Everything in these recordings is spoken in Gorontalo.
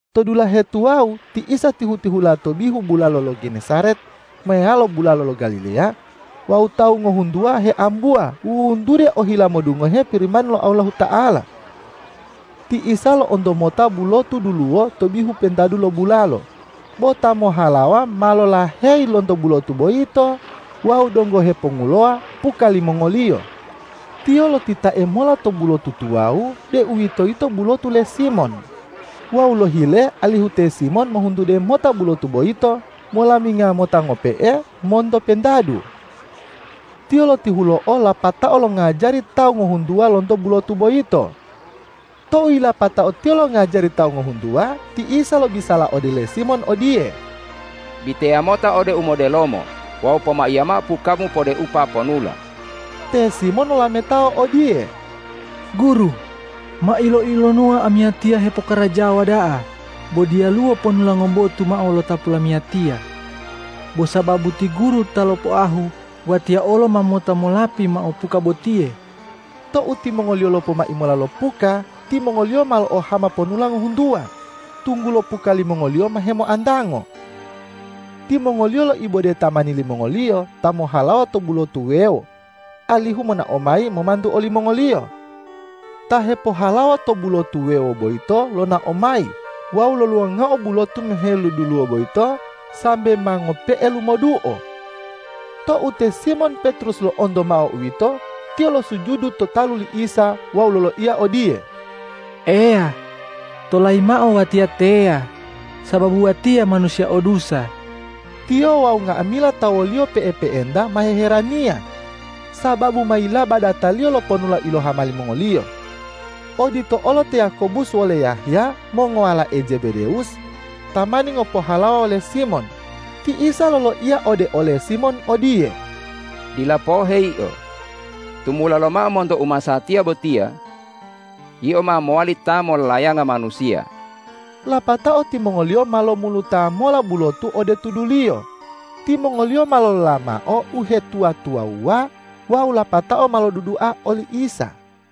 To dulahe tuwawu ti Isa tihu-tihula to bihu bulalo lo Genesaret meyalo bulalo lo Galileya wawu tawu ngohuntuwa heambuwa wuwuntude ohila modungohe Pirimani lo Allahuta'ala. Ti Isa lo'onto mota bulotu duluwo to bihu pentadu lo bulalo, bo ta mohhalawa ma lolaheyi lonto bulotu boyito wawu donggo hepongulowa puka limongoliyo. Tiyo lotitae mola to bulotu tuwawu, deuwitoyito bulotu le Simon, wawu lohile alihu te Simon mohuntude mota bulotu boyito molaminga mota ngope'e monto pentadu. Tiyo lotihulo'o lapatao longajari to tawu ngohuntuwa lonto bulotu boyito. Tou yilapatao Tiyo longajari tawu ngohuntuwa, ti Isa lobisala ode le Simon odiye,”Biteya mota ode umodelomo wawu pomaiya mao pukamu podeupa ponula.” Te Simon lolametao odiye,”Guru, ma ilo-ilonuwa amiyatiya hepokarajawa da'a, bo diyaluwo ponula ngobotu mao lotapu lamiyatiya. Bo sababu ti Guru ta lopoahu, watiya olo ma mota molapi mao puka botiye.” Tou timongoliyo lopomai mota lo puka, timongoliyo ma lo'ohama ponula ngohuntuwa, tunggulo puka limongoliyo ma hemoantango. Timongoliyo loibode tamani limongoliyo ta mohhalawa to bulotu wuwewo alihu monao mayi momantu olimongoliyo. Ta hepohalawa to bulotu wuwewo boyito lonao mayi wawu loluwangao bulotu meheluduluwo boyito, sambe ma ngope'e lumoduo. Tou te Simon Petrus lo'onto mao uwito, tiyo losujudu to talu li Isa wawu loloiya odiye,”Eya, tolayi mao watiya teya, sababu watiya manusiya o dusa!” Tiyo wawu nga'amila ta woliyo pe'epe'enta ma hiheraniya, sababu mayilaba dataliyo lo ponula ilohama limongoliyo. Odito olo te Yakobus wole Yahya, mongowalae Zebedewus, tamani ngopohalawa wole Simon. Ti Isa loloiya ode ole Simon odiye,”Dila pohe yio, tumula lomao monto umasatiya botiya yio ma mowali ta molayanga manusiya.” Lapatao timongoliyo ma lomuluta mola bulotu ode tuduliyo. Timongoliyo ma lolola mao uhetuwa-tuwawuwa wawu lapatao ma lodudua oli Isa.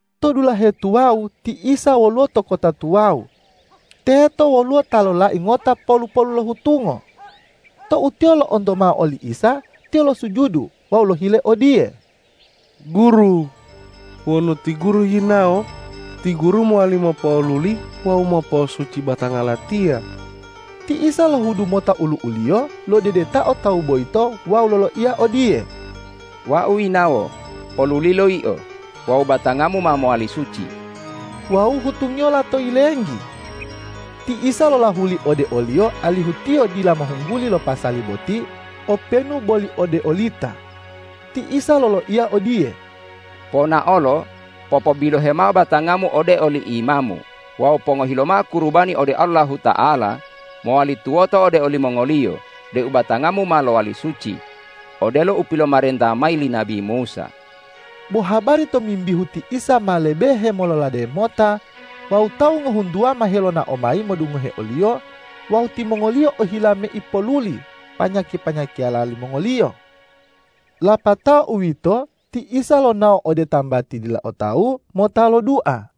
To dulahe tuwawu ti Isa woluwo to kota tuwawu. Teto woluwo ta lolai ngota polu-polu lo hutungo. Tou tiyo lo'onto mao oli Isa, tiyo losujudu wawu lohile odiye,”Guru, wonu ti Guru yinawo, ti Guru mowali mopo'oluli wawu mopo'osuci batanga latiya!” Ti Isa lohudu mota olu'u-Liyo lodedetao tawu boyito wawu loloiya odiye,”Wau yinawo, polulilo yio wawu batangamu ma mowali suci!” Wawu hutungiyo lato yilenggi. Ti Isa lolahuli ode oliyo alihu tiyo dila mohungguli lo pasali boti openu boli ode olita. Ti Isa loloiya odiye,”Ponaolo, popobilohe mao batangamu ode oli imamu wawu pongohi lomao kurubani ode Allahuta'ala mowali tuwoto ode olimongoliyo deu batangamu ma lowali suci, odelo u pilomarenta mayi li nabi Musa.” Bo habari tomimbihu ti Isa ma lebe hemololade mota wawu tawu ngohuntuwa ma helonao mayi modungohe o-Liyo wawu timongoliyo ohila meipo'oluli panya-panyakiyala limongoliyo. Lapatao uwito, ti Isa lonao ode tambati dila o tawu mota lodua.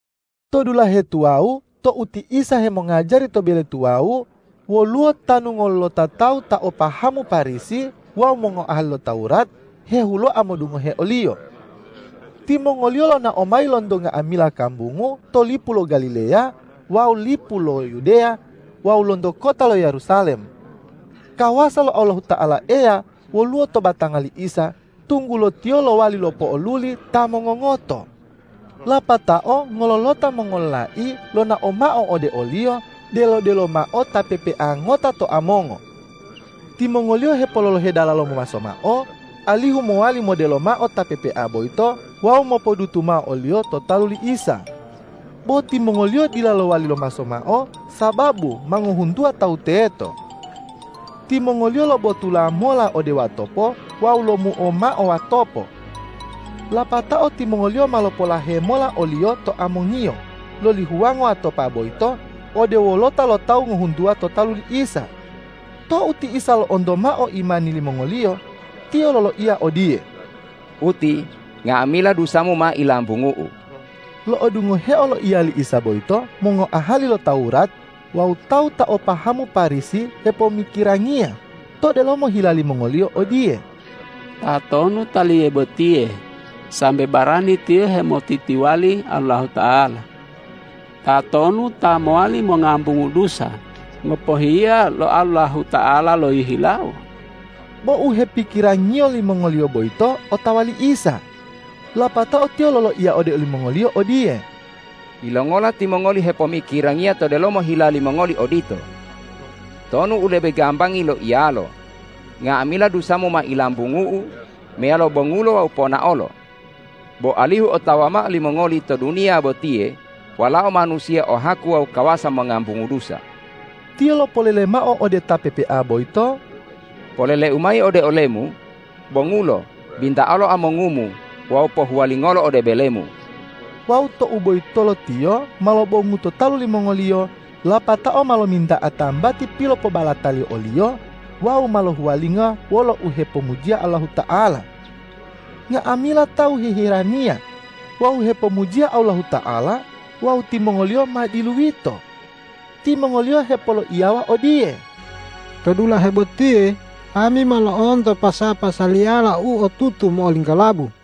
To dulahe tuwawu tou ti Isa hemongajari to bele tuwawu, woluwo tanu ngololota tawu ta o pahamu Parisi wawu mongoahali lo Tawurat hehuloa modungohe o-Liyo. Timongoliyo lonao mayi lonto nga'amila kambungu to lipu lo Galileya wawu lipu lo Yudeya wawu lonto kota lo Yerusalem. Kawasa lo Allahuta'ala Eya woluwo to batanga li Isa, tunggulo Tiyo lowali lopo'oluli ta mongongoto. Lapatao ngololota mongololai lonao mao ode o-Liyo delo-delo mao ta pepea ngota to amongo. Timongoliyo hepololohe dalalo momaso mao alihu mowali modelo mao ta pepea boyito wawu mopodutu mao oliyo to talu li Isa. Bo timongoliyo dila lowali lomaso mao, sababu ma ngohuntuwa tawu teto. Timongoliyo lobotula mola ode watopo wawu lomuo mao watopo. Lapatao timongoliyo ma lopolahe mola oliyo to amongiyo loli huwango watopa boyito ode wolota lo tawu ngohuntuwa to talu li Isa. Tou ti Isa lo'onto mao imani limongoliyo, Tiyo loloiya odiye,”Uti, nga'amila dusamu ma ilambungu-U.” Lo'odungoheo loiya li Isa boyito, mongoahali lo Tawurat wawu tawu ta o pahamu Parisi hepomikirangiya to delomo hila limongoliyo odiye,”Tatonu Taliye botiye sambe barani Tiyo hemotitiwali Allahuta'ala? Tatonu ta mowali mongambungu dusa ngopohiya lo Allahuta'ala lohihilawo?” Bo u hepikirangiyo limongoliyo boyito otawa li Isa. Lapatao Tiyo loloiya ode olimongoliyo odiye,”Yilongola timongoli hepomikirangiya to delomo hila limongoli odito? Tonu u lebe gambangi loiyalo, nga'amila dusamu ma ilambungu-U, meyalo bongulo wawu ponaolo? Bo alihu otawa mao limongoli to duniya botiye Walao Manusiya o haku wawu kawasa mongambungu dusa.” Tiyo lopolele mao ode ta pepea boyito,”Polele-U mayi ode olemu: Bongulo, binta'alo amongumu wawu pohuwalingolo ode belemu!” Wawu tou boyitolo tiyo ma lobongu to talu limongoliyo, lapatao ma lominta'a tambati pilopobalataliyo oliyo wawu ma lohuwalingo wolo uhepomujiya Allahuta'ala. Nga'amila tawu hiheraniya wawu hepomujiya Allahuta'ala wawu timongoliyo ma diluyito. Timongoliyo hepoloiyawa odiye,”To dulahe botiye ami ma lo'onto pasa-pasaliyala u otutu mo'olinggolabu.”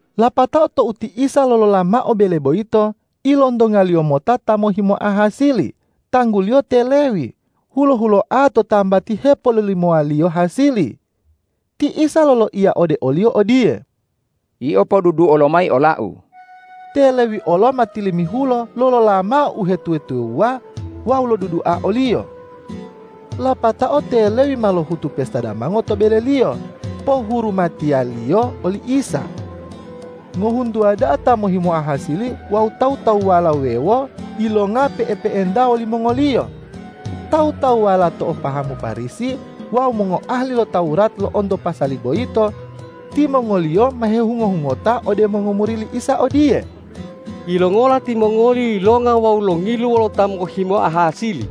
Lapatao tou ti Isa lolola mao bele boyito, ilontonga-Liyo mota ta mohhimoa hasili, tangguliyo te Lewi, hulo-huloa to tambati hepololimowaliyo hasili. Ti Isa loloiya ode oliyo odiye,”Yio, poduduo lomayi ola-U.” Te Lewi olo ma tilimihulo lolola mao uhetuwa-tuwawuwa wawu lodudua o-Liyo. Lapatao te Lewi ma lohutu pesta damango to beleliyo pohurumatiyaliyo oli Isa. Ngohuntuwa da'a ta mohhimoa hasili wawu tawu-tawuwala wuwewo yilonga pe'epe'enta wolimongoliyo. Tawu-tawuwala ta o pahamu Parisi wawu mongoahali lo Tawurat lo'onto pasali boyito. Timongoliyo ma hehungo-hungota ode mongomuri li Isa odiye,”Yilongola timongoli yilonga wawu longilu wolo ta mohhimoa hasili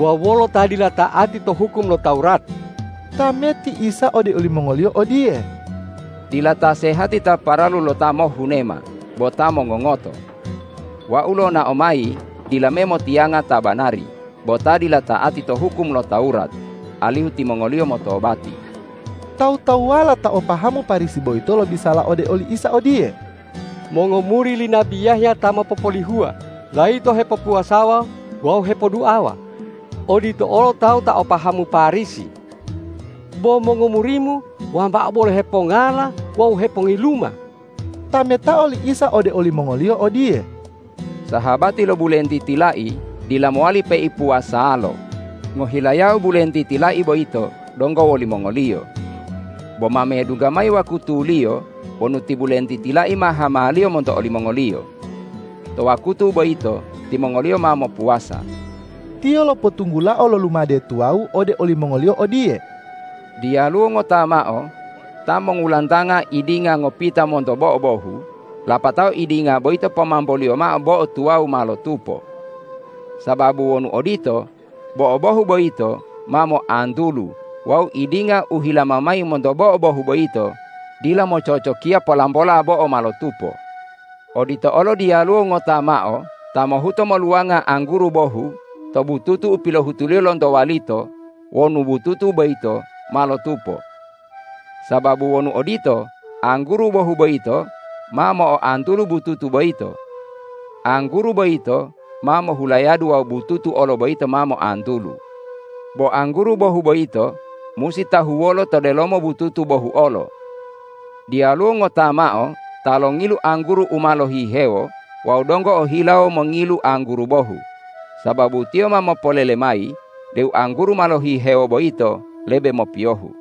wawu wolo ta dila ta'ati to hukum lo Tawurat?” Tameti Isa ode olimongoliyo odiye,”Dila ta sehati ta paralu lo ta mohhunema, bo ta mongongoto. Wau lonao mayi dila me motiyanga ta banari, bo ta dila ta'ati to hukum lo Tawurat, alihu timongoliyo motobati.” Tawu-tawuwala ta o pahamu Parisi boyito lobisala ode li Isa odiye,”Mongomuri li nabi Yahya ta mopopolihuwa layito hepopuwasawa wawu hepoduawa, odito olo tawu ta o pahamu Parisi. Bo mongomuri-Mu wambao bolo hepongala wawu hepongiluma.” Tametao li Isa ode olimongoliyo odiye,”Sahabati lo bulentiti lai dila mowali peipuwasaloa, ngohilayao bulentiti lai boyito donggo wolimongoliyo. Bo ma medungga mayi wakutuliyo wonu ti bulentiti lai ma hamaliyo monto olimongoliyo. To wakutu boyito timongoliyo ma mopuwasa.” Tiyo lopotunggulao lo lumade tuwawu ode olimongoliyo odiye,”Diyaluwo ngota mao ta mongulantanga idinga ngopita monto bo'o bohu, lapatao idinga boyito pomamboliyo mao bo'o tuwawu ma lotupo. Sababu wonu odito, bo'o bohu boyito ma moantulu wawu idinga u hilama mayi monto bo'o bohu boyito dila mococokiya polambola bo'o ma lotupo. Odito olo diyaluwo ngota mao ta mohuto moluwanga angguru bohu to bututu u pilohutuliyo lonto walito wonu bututu boyito ma lotupo. Sababu wonu odito, angguru bohu boyito ma mo'oantulu bututu boyito. Angguru boyito ma mohulayadu wawu bututu olo boyito ma moantulu. Bo angguru bohu boyito musi tahuwolo to delomo bututu bohu olo. Diyaluwo ngota mao ta longilu angguru u ma lohihewo wawu donggo ohilawo mongilu angguru bohu, sababu tiyo ma mopolele mayi deu angguru ma lohihewo boyito lebe mopiyohu.”